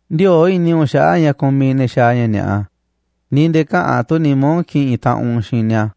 Ndiöo̱ꞌ i̱ni̱ u̱nꞌ xaꞌa̱ꞌ ña̱ kumiꞌ ne̱ xaaꞌ ña̱ ni̱a̱ꞌa, ni̱ nde̱e̱ käꞌa̱n tu̱ nimá u̱nꞌ ki̱ꞌi̱n taꞌanꞌ u̱nꞌ xiinꞌ ni̱a̱.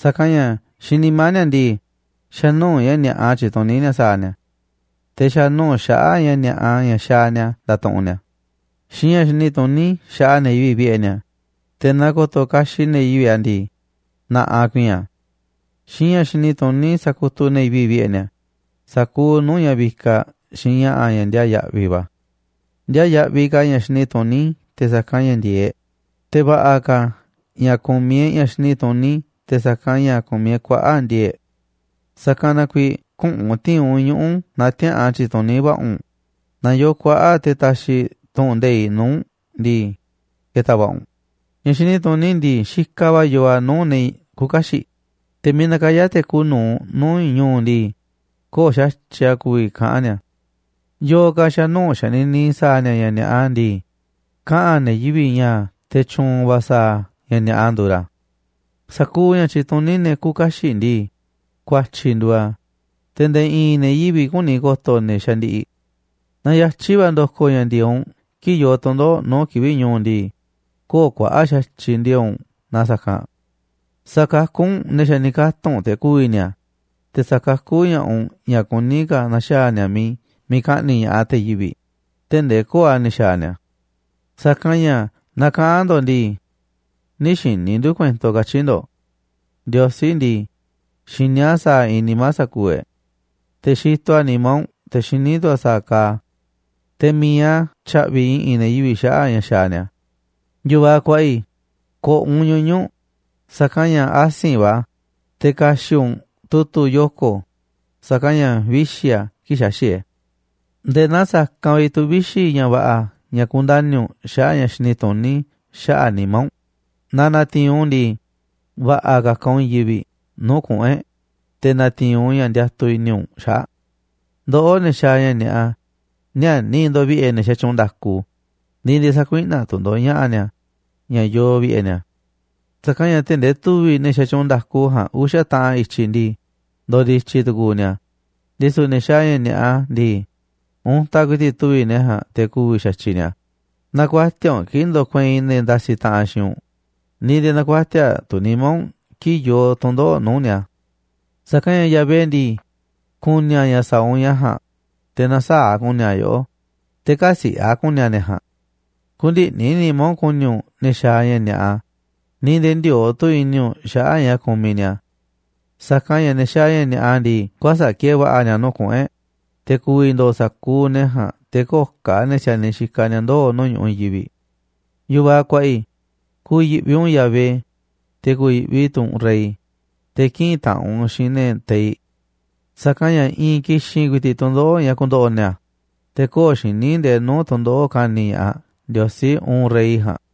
Sa̱kanꞌ ña̱ xiinꞌ nimá ni̱a̱ ndii, xa̱ nuu̱ꞌ ña̱ ni̱a̱ꞌa tyituní ni̱a̱ sa̱a̱ ni̱a̱, te̱ xa̱ nuu̱ꞌ xaꞌa̱ꞌ ña̱ ni̱a̱ꞌa ña̱ xaaꞌ ni̱a̱ ndatuꞌunꞌ ni̱a̱. Xiinꞌ ña̱ xini tuní xaꞌa ne̱ yivi̱ꞌ vi̱ꞌe̱ ni̱a̱, te̱ naaꞌ ko̱to̱ kaxiꞌ ne̱ yivi̱ꞌ a̱ ndii, na̱ꞌaꞌ ku̱i̱i̱n a̱. Xiinꞌ ña̱ xini tuní sakutuꞌ ne̱ yivi̱ꞌ vi̱ꞌe̱ ni̱a̱, sa̱kuuꞌ nuu̱ꞌ ña̱ vikaꞌ xiinꞌ ña̱ꞌa̱ ña̱ ndiaa yaꞌviꞌ va̱. Ndiaa yaꞌviꞌ ka̱ ña̱ xini tuní te̱ sa̱kanꞌ ña̱ ndi̱e̱eꞌ e̱ꞌ, te̱ va̱ꞌa̱ ka̱ ña̱ ku̱miꞌ e̱ꞌ ña̱ xini tuní te̱ sa̱kanꞌ ña̱ ku̱miꞌ e̱ꞌ kuaꞌa̱ꞌ ndi̱e̱e̱ꞌ e̱ꞌ. Sa̱kanꞌ na kuiiꞌ küꞌu̱n u̱nꞌ ti̱i̱n u̱nꞌ ñuꞌu̱ naaꞌ tiäa̱ꞌan tyi̱tuní va̱ꞌa̱ u̱nꞌ, naaꞌ yoo kuaꞌa̱ꞌ te̱ taxiꞌ tu̱ꞌu̱n nde̱iꞌ nuu̱ꞌ u̱nꞌ ndii, ke̱ta̱ va̱ꞌa̱ u̱nꞌ. Ña̱ xini tuní ndii, xikaꞌ va̱ yoo a̱ nuu̱ꞌ ne̱ küuꞌ kaxiꞌ, te̱ miiꞌ nakayá te̱ kuuꞌ nu̱uꞌ nuu̱ꞌ ñu̱u̱ ndii, köo̱ꞌ xa̱tyiꞌ a̱ ku̱vi̱ kaꞌa̱n ni̱a̱. Yo̱o̱ ka̱ xa̱nuu̱ꞌ xanini sa̱a̱ ni̱a̱ ña̱ ni̱a̱ꞌa ndii, kaꞌa̱n ne̱ yivi̱ꞌ ña̱ te̱ tyu̱u̱n va̱ sa̱a̱ ña̱ ni̱a̱ꞌa nduuꞌ ra̱. Sa̱kuuꞌ ña̱ tyituní ne̱ küuꞌ kaxiꞌ ndii, ku̱a̱tyi̱ nduuꞌ a̱, te̱ nde̱e̱ i̱i̱n ne̱ yivi̱ꞌ küni ko̱to ne̱ xandiꞌiꞌ. Naaꞌ yatyi̱ va̱ ndokoꞌ ña̱ ndi̱e̱eꞌ u̱nꞌ kii̱ꞌ yoo tu̱ndoꞌo̱ꞌ nuu̱ꞌ kivi̱ꞌ ñu̱u̱ u̱nꞌ ndii, köo̱ꞌ kuaꞌa̱ꞌ xa̱tyiꞌ ndi̱e̱e̱ꞌ u̱nꞌ na sa̱kanꞌ. Sa̱kakú u̱nꞌ ne̱ xa̱ ni̱ katu̱nꞌ te̱ ku̱vi̱ ni̱a̱, te̱ sa̱kakú ña̱ꞌaꞌ u̱nꞌ ña̱ kuní ka̱ na̱xaa̱ ni̱a̱ miiꞌ ka̱ꞌni̱ꞌ ña̱ꞌaꞌ te̱ yivi̱ꞌ tee̱ꞌ ndee köo̱ꞌ a̱ ni̱ xaaꞌ ni̱a̱. Sa̱kanꞌ ña̱ naaꞌ kaꞌa̱n ndo̱ꞌ ndii: “Nï̱ xi̱ni̱ ndu̱ kuento”, katyi̱ ndo̱ꞌ. Ndiosí ndii, xiní a̱ sa̱a̱ iinꞌ nimá sa̱kuuꞌ e̱ꞌ, te̱ xitoꞌ a̱ nimá u̱nꞌ te̱ xiní tu̱ a̱ sa̱a̱ kaaꞌ a̱. Te̱ mi̱iꞌ a̱ tya̱ꞌvi̱ i̱ꞌi̱n ne̱ yivi̱ꞌ xaꞌa̱ꞌ ña̱ xaaꞌ ni̱a̱. Yu̱vaꞌ kuaꞌa i̱, ko̱ꞌo̱ u̱nꞌ ñuñu̱ꞌ sa̱kanꞌ ña̱ asi̱nꞌ va̱ a̱, te̱ ka̱xi̱ꞌ u̱nꞌ tu̱tu̱ yoko̱ sa̱kanꞌ ña̱ vixi̱ a̱ kii̱ꞌ xaxi̱ꞌ e̱ꞌ. Nde̱e̱ naa sa̱kanꞌ vi̱ꞌ tu̱ vixi̱ ña̱ va̱ꞌa̱ ña̱ kundani̱ u̱nꞌ xaꞌa̱ꞌ ña̱ xini tuní xaꞌa̱ꞌ nimá u̱nꞌ, naaꞌ na̱ti̱i̱n u̱nꞌ u̱n ndii, va̱ꞌa̱ ka̱ka̱ u̱nꞌ i̱i̱n yivi̱ꞌ nuu̱ꞌ kuꞌu̱n e̱ꞌ, te̱ na̱ti̱i̱n u̱nꞌ ña̱ ndiatuꞌ i̱ni̱ u̱nꞌ xaꞌa̱ꞌ. Ndoꞌó, ne̱ xaaꞌ ña̱ ni̱a̱ꞌa, níäniꞌ ndo̱ꞌ vi̱ꞌe̱ ne̱ xatyuunꞌ nda̱ku, ni̱ nde̱e̱ sä̱kuiꞌnaꞌ tu̱ ndo̱ꞌ ña̱ꞌa̱ ni̱a̱ ña̱ yoo vi̱ꞌe̱ ni̱a̱. Sa̱kanꞌ ña̱ tee̱ꞌ ndee tu̱vi̱ꞌ ne̱ xatyuunꞌ nda̱ku ja̱a̱nꞌ uxa̱ taꞌan i̱tyiꞌ ndii, ndo̱ndi̱tyi̱ tu̱ku̱u̱ ni̱a̱, ndisu̱ ne̱ xaaꞌ ña̱ ni̱a̱ꞌa ndii, untaꞌ ku̱i̱ti̱ꞌ tu̱vi̱ꞌ ne̱ ja̱a̱nꞌ te̱ ku̱vi̱ xa̱tyiꞌ ni̱a̱. Nä̱ku̱a̱tiaꞌ u̱nꞌ kii̱ꞌ ndo̱kueinꞌ ne̱ ndasiꞌ taꞌanꞌ xiinꞌ u̱nꞌ, ni̱ nde̱e̱ nä̱ku̱a̱tiaꞌ tu̱ nimá u̱nꞌ kii̱ꞌ yoo tu̱ndoꞌo̱ꞌ nuu̱ꞌ ni̱a̱. Sa̱kanꞌ ña̱ Yahvé ndii, ku̱ni̱ a̱ ña̱ sa̱a̱ u̱nꞌ ja̱a̱nꞌ, te̱ na̱saa̱ꞌ a̱ ku̱ni̱ a̱ yoꞌó, te̱ kä̱siꞌe̱ ka̱ a̱ ku̱ni̱ a̱ ne̱ ja̱a̱nꞌ. Kü̱ndi̱ꞌni̱ nimá u̱nꞌ ku̱ni̱ u̱nꞌ ne̱ xaaꞌ ña̱ ni̱a̱ꞌa, ni̱ nde̱e̱ ndiöo̱ꞌ tu̱ i̱ni̱ u̱nꞌ xaꞌa̱ꞌ ña̱ kumiꞌ ni̱a̱. Sa̱kanꞌ ña̱ ne̱ xaaꞌ ña̱ ni̱a̱ꞌa ndii, kuäsa̱ꞌ ki̱e̱e̱ va̱ꞌa̱ ni̱a̱ nuu̱ꞌ kuꞌu̱n e̱ꞌ, te̱ ku̱vi̱ ndo̱o̱ sa̱kuuꞌ ne̱ jaa̱nꞌ, te̱ köo̱ꞌ ka̱ ne̱ si̱a̱niꞌ ni̱a̱ ndoo̱ nuu̱ꞌ ñu̱ꞌuꞌ i̱i̱n yivi̱ꞌ. Yu̱vaꞌ kuaꞌa i̱, ku̱yi̱ꞌvi u̱nꞌ Yahvé, te̱ ku̱yi̱ꞌvi tu̱ u̱nꞌ rey, te̱ kï̱ꞌi̱n taꞌanꞌ u̱nꞌ xiinꞌ ne̱ teiꞌ. Sa̱kanꞌ ña̱ i̱i̱n ki̱xi̱n ku̱i̱ti̱ꞌ tu̱ndoꞌo̱ꞌ ña̱ ku̱ndo̱ꞌo̱ ni̱a̱, te̱ köo̱ꞌ xiní ndee nuu̱ꞌ tu̱ndoꞌo̱ꞌ ka̱ni̱ ña̱ꞌaꞌ Ndiosí, uun rey ja̱a̱nꞌ.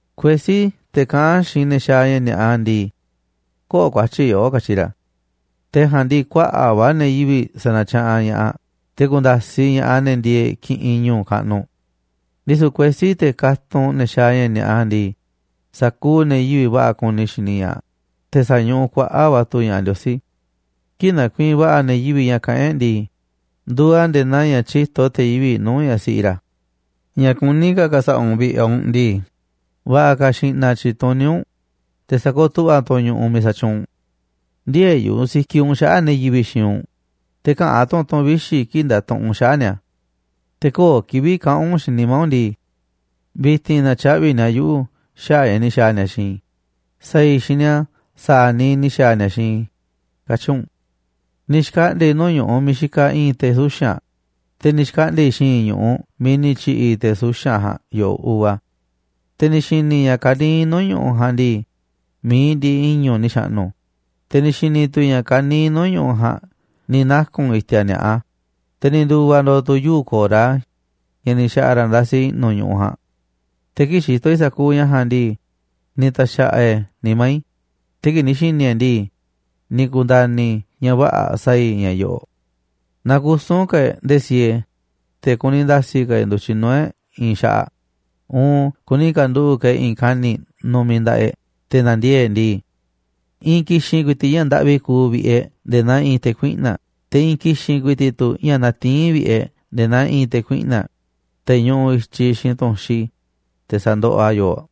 Kuesí, te̱ kaꞌán xiinꞌ te̱ xaaꞌ ña̱ ni̱a̱ꞌa ndii: “Köo̱ꞌ ku̱a̱tyi̱ yoꞌó”, katyi ra̱. Te̱ ja̱a̱nꞌ ndii, kuaꞌa̱ꞌ va̱ ne̱ yivi̱ꞌ sa̱na̱tyaꞌanꞌ ña̱ꞌaꞌ, te̱ ku̱nda̱siꞌ ña̱ꞌaꞌ ne̱ ndieeꞌ kiꞌinꞌ ñu̱u̱ kaꞌnuꞌ. Ndisu̱ kuesí, te̱ katunꞌ ne̱ xaaꞌ ña̱ ni̱a̱ꞌa ndii, sa̱kuuꞌ ne̱ yivi̱ꞌ va̱ꞌa̱ kuni xini ña̱ꞌaꞌ, te̱ sa̱ñuꞌuꞌ kuaꞌa̱ꞌ va̱ tu̱ ña̱ꞌaꞌ Ndiosí. Kii̱ꞌ nakuiinꞌ va̱ꞌa̱ ne̱ yivi̱ꞌ ña̱ kaꞌán e̱ꞌ ndii, nduuꞌ a̱ nde̱e̱ naa ña̱ tyíto te̱ yivi̱ꞌ nuu̱ꞌ ñaꞌ siꞌi ra̱. Ña̱ kuní ka̱ ka̱sa̱ꞌa̱ u̱nꞌ vi̱ꞌe̱ u̱nꞌ ndii, va̱ꞌa̱ ka̱ xi̱ꞌna̱ tyi̱tuní u̱nꞌ, te̱ sa̱kooꞌ tu̱ꞌva̱ tu̱ u̱nꞌ ñu̱ꞌuꞌ miiꞌ sa̱tyuunꞌ u̱nꞌ. Ndï̱e̱e̱ yu̱ꞌuꞌ sikiꞌ u̱nꞌ xaꞌa̱ꞌ ne̱ yivi̱ꞌ xiinꞌ u̱nꞌ, te̱ käꞌa̱n tu̱ u̱nꞌ tu̱ꞌu̱n vixi̱ kii̱ꞌ ndatuꞌunꞌ u̱nꞌ xaꞌa̱ꞌ ni̱a̱. Te̱ köo̱ꞌ kivi̱ꞌ kaꞌa̱n u̱nꞌ xiinꞌ nimá u̱nꞌ ndii: “Vi̱ti̱n na̱tyaꞌvi̱ ni̱a̱ yuꞌu̱ xaꞌa̱ꞌ ña̱ ni̱ xa̱a̱ ni̱a̱ xiinꞌ i̱. Sa̱a̱ i̱ xiinꞌ ni̱a̱ sa̱a̱ niiꞌ ni̱ xa̱a̱ ni̱a̱ xiinꞌ i̱”, katyi̱ u̱nꞌ. Ni̱ xkaꞌndi̱a̱ i̱ nuu̱ꞌ ñu̱ꞌuꞌ miiꞌ xikaꞌ i̱i̱n te̱ suxa̱nꞌ, te̱ ni̱ xkaꞌndi̱a̱ i̱ xi̱i̱nꞌ ñu̱ꞌuꞌ miiꞌ ni̱ tyi̱ꞌi̱ te̱ suxanꞌ ja̱a̱nꞌ yo̱ꞌoꞌ uva. Te̱ ni̱ xi̱ni̱ i̱ ña̱ ka̱niiꞌ nuu̱ꞌ ñu̱ꞌuꞌ ja̱a̱nꞌ ndii, mi̱iꞌ ndiꞌiꞌ i̱ñu̱ꞌ ni̱ xa̱ꞌnu̱, te̱ ni̱ xi̱ni̱ tu̱ i̱ ña̱ ka̱niiꞌ nuu̱ꞌ ñu̱ꞌuꞌ ja̱a̱nꞌ ni̱ naku̱n i̱ti̱a̱ ni̱a̱ꞌa, te̱ ni̱ ndu̱va̱ ndo̱o̱ tu̱ yuu̱ꞌ ko̱ra ña̱ ni̱ xa̱ꞌa̱ ra̱ ndasi i̱ꞌnu̱ ñu̱ꞌuꞌ ja̱a̱nꞌ. Te̱ kii̱ꞌ xitoꞌ i̱ sa̱kuuꞌ ña̱ ja̱a̱nꞌ ndii, ni̱ ta̱xa̱ꞌa̱ e̱ꞌ e̱ nimá i̱, te̱ kii̱ꞌ ni̱ xi̱ni̱ e̱ꞌ e̱ ndii, ni̱ ku̱nda̱ni̱ i̱ ña̱ vä̱ꞌa̱ sa̱a̱ i̱ ña̱ yo̱ꞌo̱ꞌ: naaꞌ kusu̱n ka̱ e̱ꞌ nde̱e̱ siee, te̱ kuni nda̱si̱ ka̱ e̱ꞌ ndu̱tyiꞌ nuu̱ꞌ e̱ꞌ i̱i̱n xaꞌaꞌ uun kuni ka̱nduꞌu̱ꞌ ka̱ e̱ꞌ i̱i̱n kani̱ꞌ nu̱mi̱ nda̱ꞌaꞌ e̱ꞌ te̱ na̱ndiee̱ꞌ e̱ꞌ ndii, i̱i̱n ki̱xi̱n ku̱i̱ti̱ꞌ ña̱ ndaꞌvi kuuꞌ vi̱ꞌe̱ e̱ꞌ nde̱e̱ naa i̱i̱n te̱ kuiꞌna̱ꞌ, te̱ i̱i̱n ki̱xi̱n ku̱i̱ti̱ꞌ tu̱ ña̱ natiín vi̱ꞌe̱ e̱ꞌ nde̱e̱ naa i̱i̱n te̱ kuiꞌna̱ꞌ, te̱ ñuꞌuꞌ i̱tyiꞌ xiinꞌ tu̱nxi, te̱ sa̱ndoꞌoꞌ a̱ yooꞌ.